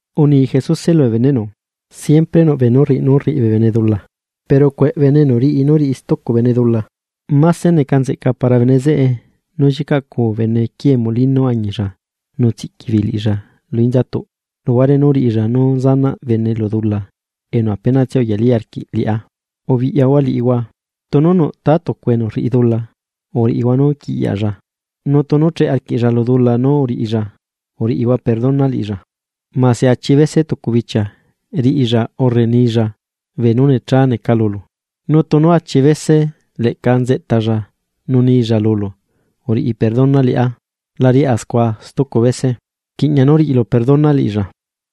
Uni Jesuse lubee beneꞌnu: ―Siempre nuꞌ beenú rriꞌi nú rriꞌi bee bene dula, pero ¡cueꞌ bene enu riꞌi nú riꞌi stucu bene dula! Máse neca nzeꞌca para bene zeꞌe nú llicaꞌcuu bene quie molino añilla nu tsiꞌqui beei liꞌilla lu inzatuꞌ, luhuare nú riꞌilla nú sanaꞌ bene lu dula enu apenatsia uyalí arquiꞌ liꞌá. ¡Ubiꞌyahua liꞌihua! ’Tunu nuꞌ ta tucu enu rriꞌi dula, uriꞌihua nú quiꞌyalla, nu tunu cheꞌe arquiꞌlla lu dula nú uriꞌilla, uriꞌihua perdona liꞌilla. Mase achi bese tucu bichia riꞌilla urre nilla bee nú necha neca lulu, nu tunu achi bese leꞌca entalla nu nilla lulu uriꞌi perdona liꞌá: “La riꞌá scua stucu bese.” Rquiꞌña nú riꞌilu perdona liꞌilla.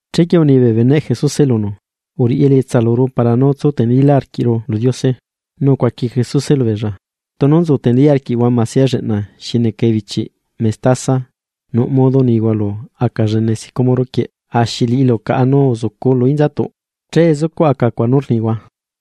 Chequie uni bee beneꞌ Jesuse lunu: ―Uriꞌi elietsa luru para nú tsu tenelílá arquiꞌru lu Diose. Nu ucuaqui Jesuse lubeella: ―Tunu nzu tenelí arquiꞌhua masia lleꞌna xi neca ebichiꞌ mestaza, nuꞌ modo nihua lu aca llene sicómoro quieꞌ: “Axi liꞌilu caꞌa nu uzucu lu inzatuꞌ”, che zucuꞌ aca cuaꞌ nú rnihua.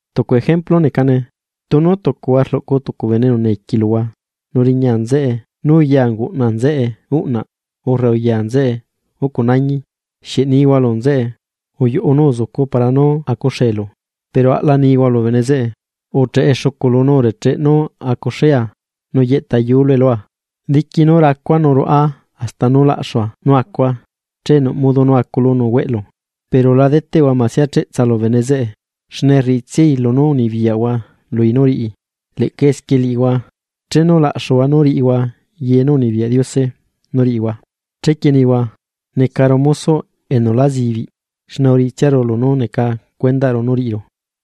’Tucu ejemplu necane, tunu tucuhua rluꞌcu tucu bene enu neca esclavo luhua, nu riña nzeꞌe nú uya unguꞌna nzeꞌe uꞌnaꞌ urre uya nzeꞌe ucu nañi, ¿xieꞌ nihua lu nzeꞌe: “Uyuꞌu nu uzucu para nú acuxelu”? Pero aꞌla nihua lu bene zeꞌe: “Ucheꞌe xuculu nu urecheꞌe nú acuxea nu yeꞌta yulue lua, diqui nú racua nu ruaꞌa hasta nú laꞌxua nú acua. Che nuꞌ modo nú aculu nu hueꞌlu.” Pero la deteꞌhua masia cheꞌtsa lu bene zeꞌe, xne rriꞌitsiai lunú unibiyaꞌhua lui nú riꞌi. Leꞌca esquie liꞌihua, chenu laꞌxuhua nú riꞌihua ye nú unibiyaꞌ Diose nú riꞌihua, chequie nihua: “Necaru mosoꞌ enu la zibiꞌ, xne uriꞌitsiaru lunú neca cuendaꞌru nú riꞌiru.”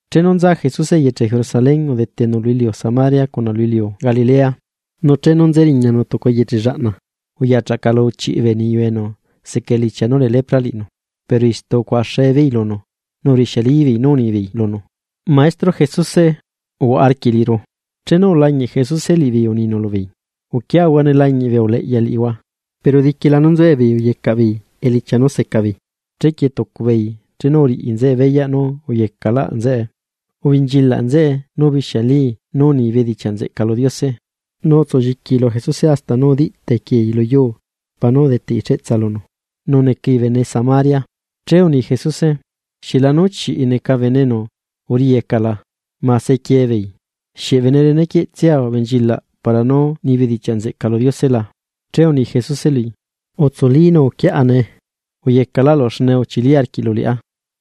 Chenu nza Jesuse eyeche Jerusalén, udetenu lu iliu Samaria cuna lu iliu Galilea. Nu chenu nze chuꞌunu tucu eyeche llaꞌna, uyachaꞌcalu chiꞌi bee niyu enu seca elichia nú lee lepra liꞌinu, pero istu ucuaꞌaxe beei lunu, nu urixialibeei nú unibeei lunu: ―¡Maestro, Jesuse, uhuaꞌa arquiꞌ liꞌiru! Chenu ulañiꞌ Jesuse liꞌibeei, uninu lubeei: ―Uquiahua ne lañiꞌ bee uleꞌya liꞌihua. Pero diquila nú nzuebeei uyecaꞌ beei elichia nú seca beei. Chequie tucu beei, chenu uriꞌi nzeꞌe beyaꞌ nú uyecaꞌlaꞌ nzeꞌe, ubenchilaꞌ nzeꞌe nu ubixialii nú uni bedichiaꞌ nzeꞌca lu Diose. Nu utsulliquii lu Jesuse hasta nú udiꞌ tequiei lu yuu para nú udeteꞌi cheꞌtsa lunu, nu necai bene Samaria. Che uni Jesuse: ―¿Xieꞌlanú chiꞌi neca bene enu uriyeca la? ¿Ma sequie beei? ¿Xieꞌ bene rene quieꞌtsia ubenchilaꞌ para nú ni bedichiaꞌ nzeꞌca lu Diose la? Che uni Jesuse lui: ―Utsuli, nu uquiaꞌa nee. Uyecaꞌlaꞌlu xne uchili arquiꞌlu liꞌá.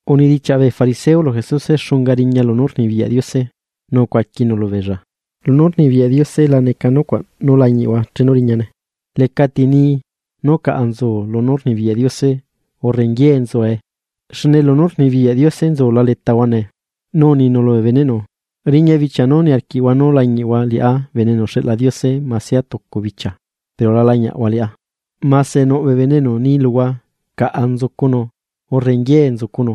Unidichiaꞌ bee fariseo lu Jesuse xunga riña lunú rnibiyaꞌ Diose, nu ucuaquinu lubeella: ―Lunú rnibiyaꞌ Diose la neca nucuaꞌ nú lañiꞌhua chenu riñane. Lecati ni: “Nú caꞌa nzu lunú rnibiyaꞌ Diose”, urre “nguié nzuee”; xne lunú rnibiyaꞌ Diose nzula letahua nee. Nu uninu lubee beneꞌnu: ―Riña bichia nú niarquiꞌhua nú lañiꞌhua liꞌá Bene enu uxeꞌla Diose masia tucu bichia pero la lañiaꞌhua liꞌá. Mase nuꞌ bee bene enu ni luhua: “Caꞌa nzucunu”, urre “nguié nzucunu”,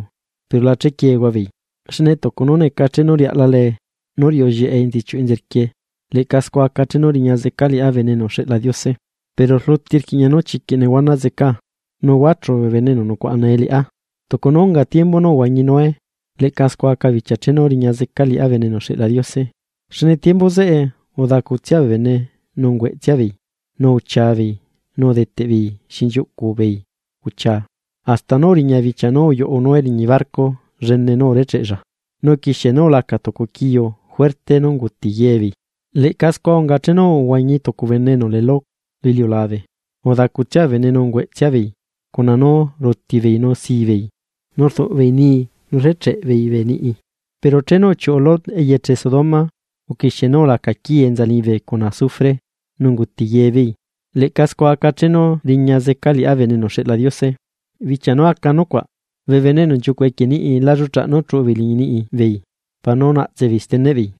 pero la chequiehua beei. Xne tucu nú neca chenu riaꞌla lee nu riuꞌu llieꞌe enzichiuꞌ enzerquie, leꞌca scua aca chenu riña zeca liꞌá Bene enu uxeꞌla Diose. Pero rluti rquiꞌña nú chiquiꞌ nehuana zecaa, nu huachu bee bene enu nucuaꞌa nee liꞌá. Tucu nú unga tiembu nú uhuañi Noé, leꞌca scua aca bichia chenu riña zeca liꞌá Bene enu uxeꞌla Diose. Xne tiembu zeꞌe, udacutsia bee bene nu ungueꞌtsia beei, nu uchia beei nu udeteꞌbeei xinchiuꞌcu beei uchia, hasta nú uriña bichia nú uyuꞌu Noé liñi barco llene nú urecheꞌella, nu uquixie nú ulaca tucu quiu juerte nu unguti ye beei. Leꞌca scua unga chenu uhuañi tucu bene enu lee Lot lu iliulabe: udacutsia bee bene nu ungueꞌtsia beei, cuna nú ruti beei nu si beei, nu rduꞌ beei nii nu rrecheꞌe beei bee niꞌi. Pero chenu uchiuꞌu Lot eyeche Sodoma, uquixie nú ulaca quii enza liñibe cuna azufre, nu unguti ye beei. Leꞌca scua aca chenu riña zeca liꞌá Bene enu uxeꞌla Diose. ’Bichia nú aca bee nucuaꞌ, bee bene enu nchiucuꞌ equie niꞌi la lluꞌchaꞌ chuꞌu beei liñi niꞌi beei para nú naꞌtse beei steneꞌ beei,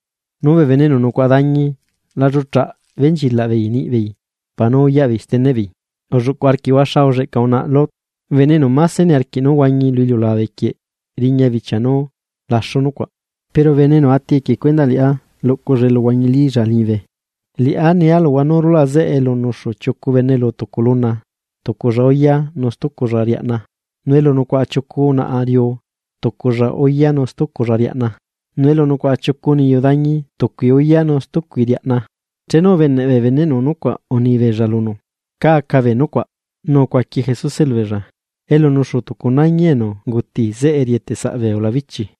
nu bee bene enu nucuaꞌa dañi la lluꞌchaꞌ benchilaꞌ beei niꞌbeei para nú uyaꞌbeei steneꞌbeei. Ulluꞌcuꞌ arquiꞌhua xa ulleꞌca unaꞌa Lot. Bene enu máse niarquiꞌ nú huañi lu iliulabe quieꞌ riña bichia nú laxu nucuaꞌ, pero bene enu ati equie cuendaꞌ liꞌá luꞌculla eluhuañilílla liñibe. ’Liꞌá nia luhua nú rulaꞌ zeꞌe elu nucuaꞌa chiucu bene lu tucu luna, tuculla uya nu stuculla riaꞌna. Nu elu nucuaꞌa chiucu unaꞌa riu, tuculla uya nu stuculla riaꞌna. Nu elu nucuaꞌa chiucu niyu dañi, tucui uya nu stuculla riaꞌna. Chenu ubeneꞌ bee beneꞌnu nucuaꞌ uni beella lunu: ―¿Cá aca bee nucuaꞌ? Nu ucuaqui Jesuse lubeella: ―Elu nuxu tucu nañi enu unguti zeꞌe rieteꞌ saꞌ bee ulabichi.